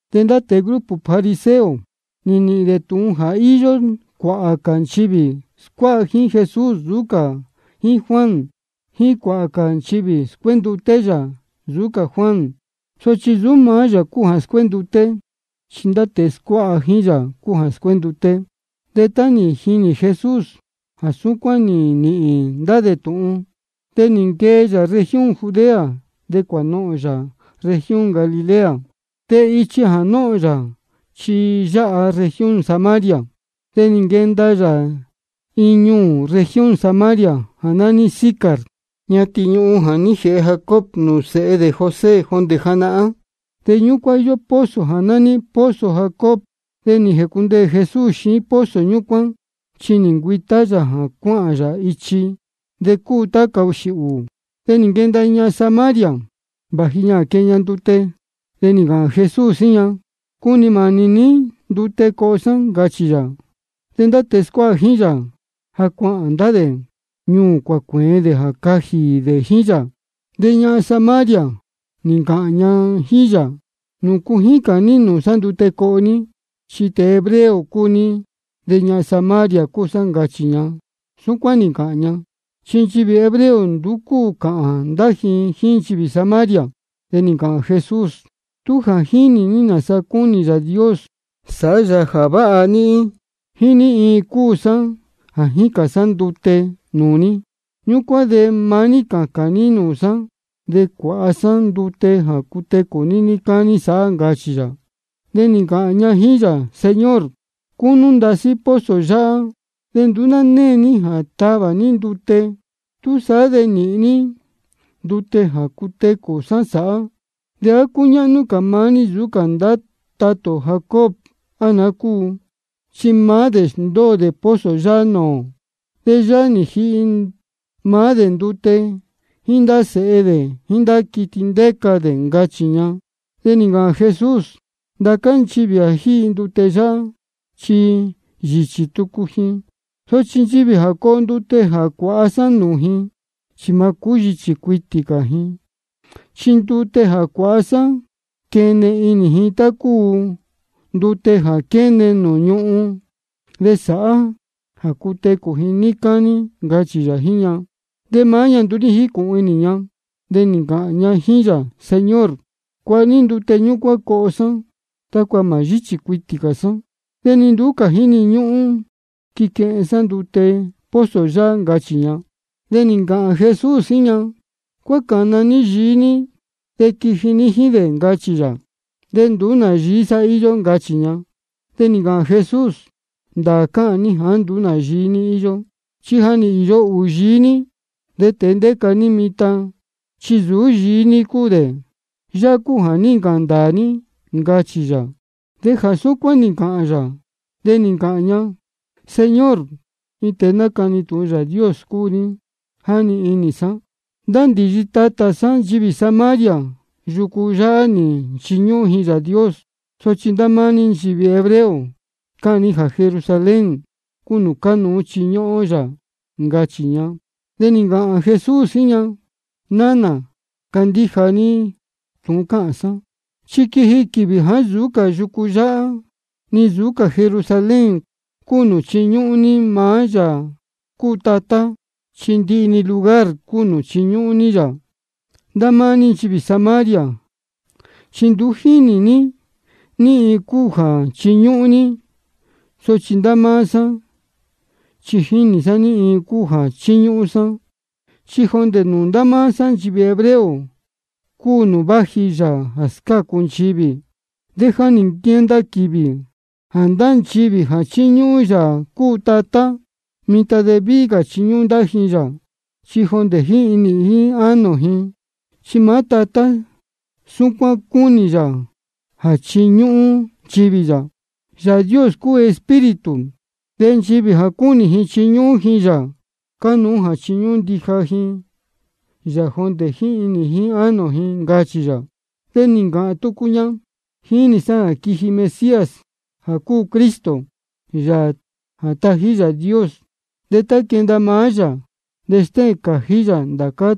De ndá tēe grupo fariseo, nī nīhīn dē tūhun jā íyó cuāhā cā nchivī scuáha jíín Jesús nsūú cā jíín Juan, jíín jā cuāhā cā nchivī scuénduté yā nsūú cā Juan. Sochi nsūú maá yā cúu jā scuénduté, chi ndá tēe scuáha jíín yā cúu jā scuénduté. De tá nī jinī Jesús jā súcuán nī nīhīn ndá dē tūhun, de nī nquee yā región Judea, de cuānohōn yā región Galilea. De ichi jā nóhōn yā chi yáha región Samaria. De nī nquenda yā iin ñuū región Samaria jā nání Sicar, ñatin ñuhun jā ní jēhe Jacob nūū sēhe dē José jondē janahán. De ñúcuán íyó pozo jā nání pozo Jacob. De nī jēcundeē Jesús xiín pozo ñúcuán, chi nī ncuītá yā jā cuáhān yā ichi. De cúu tá cahūxī ūū. De nī nquenda iin ñahan Samaria, vāji ña jā quehen ña ndute. De nī ncāhān Jesús jíín ña: Cunī mānī ní ndute coho sá, ncachī yā. De ndá tēe scuáha jíín yā, ja cuāhān ndá dē ñuū cuācuēen dē jā cajī dē jíín yā. De ñahan Samaria nī ncāhān ña jíín yā: ¿Nūcu jícān ní ndute nūū sá coho ní? Chi tēe hebreo cúu ní, de ñahan Samaria cúu sá, ncachī ña. Súcuán nī ncāhān ña, chi nchivī hebreo nduú cáhān ndá ji jíín nchivī Samaria. De nī ncāhān Jesús: Tú jā jínī ní nāsa cúnī Yāā Dios sāhá yā jā váha níhín, jíín ní iin cúu sāán jā jícān sá ndute nūū ní, ñúcuán de maá ní cācān ní nūū sá, de cuāha sá ndute jā cutecū ní níí cání sāhá, ncachī yā. De nī ncāhān ña jíín yā: Señor, cúnú ndasí pozo yáhá, de nduú ná née ní jā tavā ní ndute. ¿Túsaá de ní nīhīn ní ndute jā cutecū sá sāhá? ¿De á cúñáhnú cā maá ní nsūú cā tatá ó Jacob, á naá cúu? Chi maá dē nī sndóo dē pozo yáhá nūū ō. De yáhá nī jihi maá dē ndute, jíín ndá sēhe dē, jíín ndá quiti ndéca dē, ncachī ña. De nī ncāhān Jesús: Ndācá nchivī jā jíhi ndute yáhá, chi yīchī tucu ji. Sochi nchivī jā coho ndute jā cuāha sá nūū ji, chi mā yíchī cuitī cā ji. Chi ndute jā cuāha sá quene inī ji tá cúu ndute jā quéne nūū ñūhún, de sāhá jā cutecū ji níí cání, ncachī yā jíín ña. De maá ña nduú ní jícūhun inī ña, de nī ncāhān ña jíín yā: Señor, cuāha ní ndute ñúcuán coho sá, tácua mā yíchī cuitī cā sá, de ni nduú cā jíni ñúhún quiquehen sá ndute pozo yáhá, ncachī ña. De nī ncāhān Jesús jíín ña: Cuácāna ní yií ní de quiji ní jíín dē, ncachī yā. Nduú nā yií sá íyó, ncachī ña. De nī ncāhān Jesús: Ndāā cáhān ní jāá nduú nā yií ní íyó. Chi ja nī īyo ūhūn yií ní, de tēe ndéca ní mitan chi nsūú yií ní cúu dē. Yāhá cúu jā ní ncāhān ndāā ní, ncachī yā. De jā súcuán nī ncāhān yā, de nī ncāhān ña: Señor, iin tēe nácani tūhun Yāā Dios cúu ní, jáni inī sá. Ndá ndīyi tatā sá nchivī Samaria, yucu yáhá nī nchiñúhún ji Yāā Dios. Sochi ndá máá ní nchivī hebreo, cáhān ní jā Jerusalén cúu nūū cánuú chiñúhún ó yā, ncachī ña. De nī ncāhān Jesús jíín ña: Nánā, candíja ní tūhun cáhān sá, chi quiji quīvī jāá nsūú yucu yáhá ni nsūú Jerusalén cúu nūū chiñúhún ní maá Yāā cúu Tatá, chi ndihi-ni lugar de cuu chiñúhún ní yā. Ndá máá ní nchivī Samaria chi nduú jínī ní ní iin cúu jā chíñúhún ní. Sochi ndá máá sá chi jínī sá ní iin cúu jā chíñúhún sá. Chi jondē nūū ndá máá sá nchivī hebreo cúu nūū váji Yāā jā scácu nchivī. De ja nī nquenda quīvī jā ndá nchivī jā chíñúhún Yāā cúu Tatá, mitan de víhí cā chiñúhún ndija ji yā, chi jondē jíín inī jíín ánō ji. Chi maá Tatá súcuán cúnī yā jā chiñúhún nchivī yā. Yāā Dios cúu Espíritu, de nchivī jā cúnī ji chiñúhún ji yā, cánuú jā chiñúhún ndija ji yā jondē jíín inī jíín ánō ji, ncachī yā. De nī ncāhān tucu ña: Jínī sá jā quiji Mesías jā cúu Cristo, Yāā jā tají Yāā Dios. De tá quenda maá yā, de stéhēn cājí yā ndācá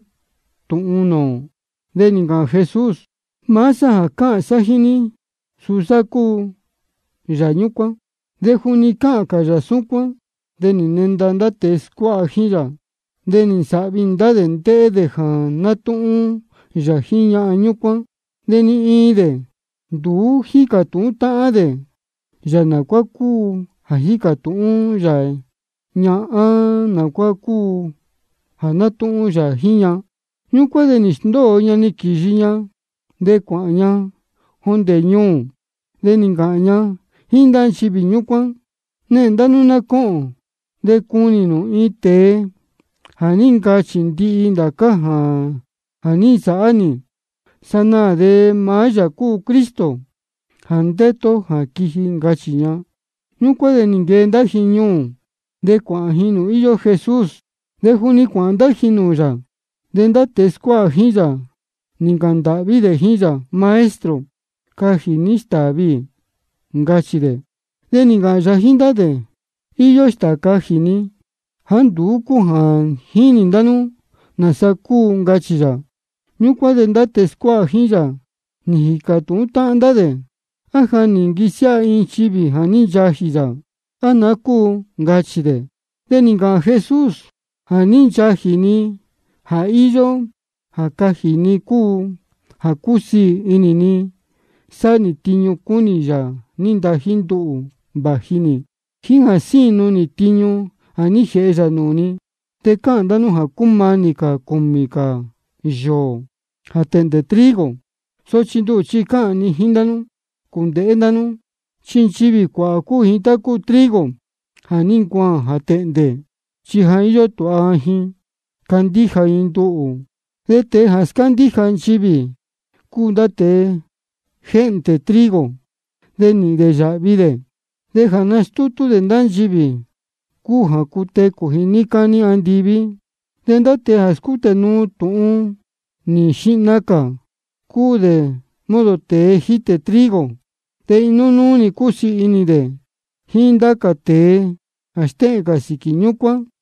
tūhun nūū ō. De nī ncāhān Jesús: Maá sá jā cáhān sá jíín ní, suu sá cúu Yāā ñúcuán. De juni cáhān cā yā súcuán, de nī nenda ndá tēe scuáha jíín yā. De sáhvi inī ndá dē ndéhé dē jā nátúhún yā jíín ñahan ñúcuán. De ni iin dē nduú ní jícā tūhún dē yā naá cúu jā jícā tūhún yā ña á naá cúu jā nátúhún yā jíín ña. Ñúcuán de nī sndóo ña quīyi ña, de cuāhān ña jondē ñuū. De nī ncāhān ña jíín ndá nchivī ñúcuán: Nehēn ndá nú ná cóhōn de cunī nū iin tēe jā ní ncachī ndihi ndācá jā ní nsāhá nī. Sanaā de maá yā cúu Cristo jā ndétu ó jā quiji, ncachī ña. Ñúcuán de nī nquee ndá ji ñuū, de cuāhān ji nūū íyó Jesús. De juni cuāhān ndá ji nūū yā, de ndá tēe scuáha jíín yā nī ncāhān ndāhví dē jíín yā: Maestro, cajī ní stāā viī, ncachī dē. De nī ncāhān yā jíín ndá dē: Iyó stāā cajī ni jāá nduú jínī ndá nú nāsa cúu, ncachī yā. Ñúcuán de ndá tēe scuáha jíín yā nī jīcā tūhún táhán ndá de: ¿A ja nī nquisiáha iin nchivī jā ní nchajī yā, á naá cúu? ncachī dē. De nī ncāhān Jesús: Jā ní ncachī ni jā íyó jā cajī ni cúu jā cúsiī inī ni sáhá nī tiñu cúnī Yāā nī ntají nduhū vāji nī, jíín jā sínu nī tiñu jā ní jēhe yā nūū ni. De cáhān ndá nú jā cúmanī cūmī cā yōō de tēhndē trigo. Sochi nduhū chi cáhān ni jíín nú: Cūndēhé ndá nú, chi nchivī cuāhā cúu ji tá cúu trigo jā ní ncuaān jā tēhndē, chi ja íyó tūha ji candíja ji nduhū. De ndá tēe scándíja nchivī, cúu dē tá cúu tēe jéhndē trigo, de nīhīn dē yāhvi dē. De jā nástútú ndá dē nchivī cúu jā cutecū ji níí cání andiví. De ndá tēe jā scútē nuu tūhun nī xihna cā, cúu dē modo tēe jítē trigo, de inuú-ni cusiī inī dē jíín ndá cā tēe jā stéhēn cā sīquī ñúcuán.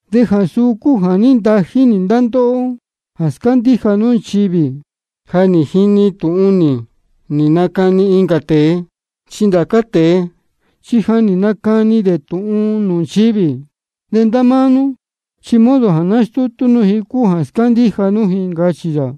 De jā suu cúu jā ní ntají nī ndá ndóhó jā scándíja nú nchivī ja nī jini tūhun nī nī nacani incā tēe. Chi ndá cā tēe chi ja nī nacani dē tūhun nūū nchivī, de ndá máá nú chi modo jā nástútú nú ji cúu jā scándíja nú ji, ncachī yā.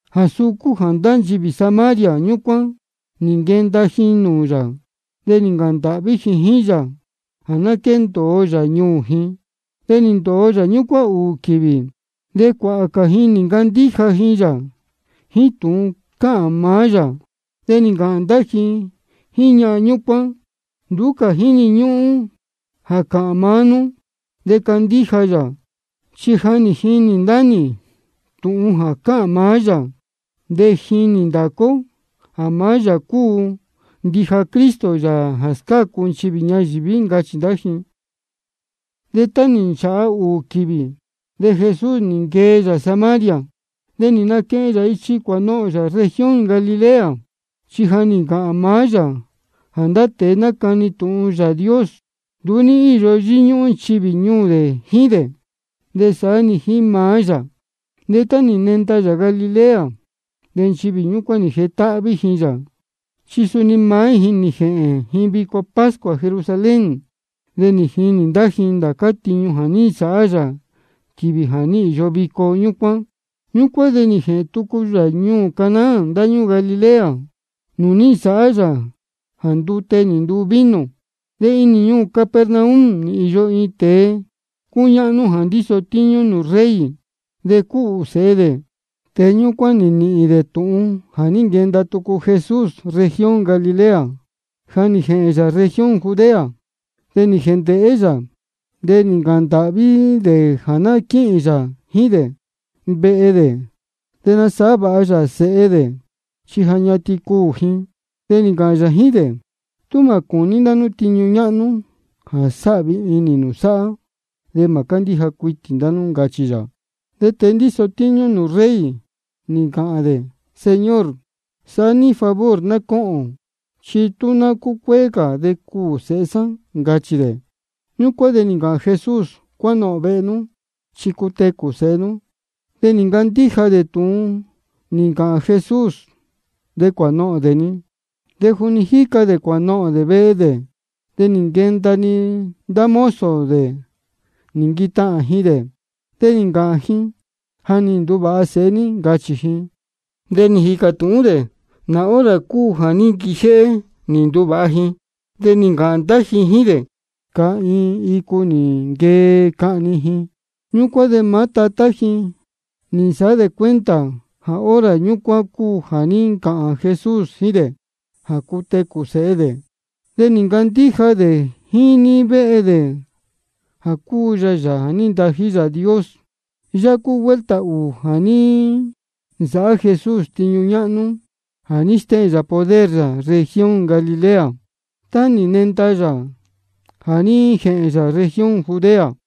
Jā suu cúu jā ndá nchivī Samaria ñúcuán nī nquenda ji nūū yā, de nī ncāhān ndāhví ji jíín yā jā ná quéndōo yā ñuū ji. De nī ndōo yā ñúcuán ūū quīvī. De cuāhā cā ji nī ncandíja ji yā jíín tūhun cáhān maá yā. De nī ncāhān ndá ji jíín ñahan ñúcuán: Nduú cā jíni ñúhún jā cāhān maá nú de candíja nī yā, chi ja nī jini ndá nī tūhun jā cáhān maá yā. De jínī ndācá ó jā maá yā cúu ndija Cristo, Yāā jā scácu nchivī ñayīví, ncachī ndá ji. De tá nī nchāha ūū quīvī, de Jesús nī nquee yā Samaria, de nī naquehen yā ichi cuānohōn yā región Galilea. Chi ja nī ncāhān maá yā jā ndá tēe nácani tūhun Yāā Dios, nduú íyó yíñúhún nchivī ñuū dē jíín dē, de saá-ni jíín maá yā. De tá nī nenda yā Galilea, de nchivī ñúcuán nī jetáhví ji yā, chi suni maá ji nī jēhēn ji vico pascua Jerusalén, de nī jinī ndá ji ndācá tiñu nī nsāhá yā quīvī jā ní īyo vico ñúcuán. Ñúcuán de nī jēhēn tucu yā ñuū Caná ndáñúū Galilea, nūū ní nsāhá yā jā ndute nī nduu vino. De inī ñuū Capernaum nī īyo iin tēe cúñáhnú jā ndíso tíñú nūū rey. De cúhū sēhe dē. Tēe ñúcuán nī nīhīn dē tūhun jā ní nquenda tucu Jesús región Galilea jā ní jēhēn yā región Judea. De nī jēndēhé dē yā, de nī ncāhān ndāhví dē jā ná quíhīn yā jíín dē vehe dē, de nasāhá vāha yā sēhe dē, chi ja ñatin cuū ji. De nī ncāhān yā jíín dē: Tú mā cūní nú ndá tiñu ñáhnú jā sāhvi inī nū sāhá, de mā cándíja cuitī ndá nú, ncachī yā. De tēe ndíso tíñú nūū rey, nī ncāhān dē: Señor, sāhá ní favor ná cóhōn, chi tú ná cúcuéé ní de cuū sēhe sá, ncachī dē. Ñúcuán de nī ncāhān Jesús: Cuánohōn vehe nú, chi cutecū sēhe nú. De nī ncandíja dē tūhun nī ncāhān Jesús, de cuānohōn dē-ni. De juni jíca dē cuānohōn dē vehe dē, de nī nquenda ndá mozo dē nī nquitahān ji dē, de nī ncāhān ji: Ja nī nduvāha sēhe ní, ncachī ji. De nī jīcā tūhún dē nā hora cúu jā ní nquijéhé nī nduvāha ji. De nī ncāhān ndá ji jíín dē: Cahiin icu nī nquee cahni ji. Ñúcuán de maá tatá ji nī nsāhá dē cuenta jā hora ñúcuán cúu jā ní ncāhān Jesús jíín dē jā cutecū sēhe dē. De nī ncandíja dē jíín níí vehe dē jā cúu yā Yāā jā ní ntají Yāā Dios. Yáhá cúu vuelta ūū jā ní nsāhá Jesús tiñu ñáhnú jā ní stéhēn yā poder yā región Galilea, tá nī nenda yā jā ní jēhēn yā región Judea.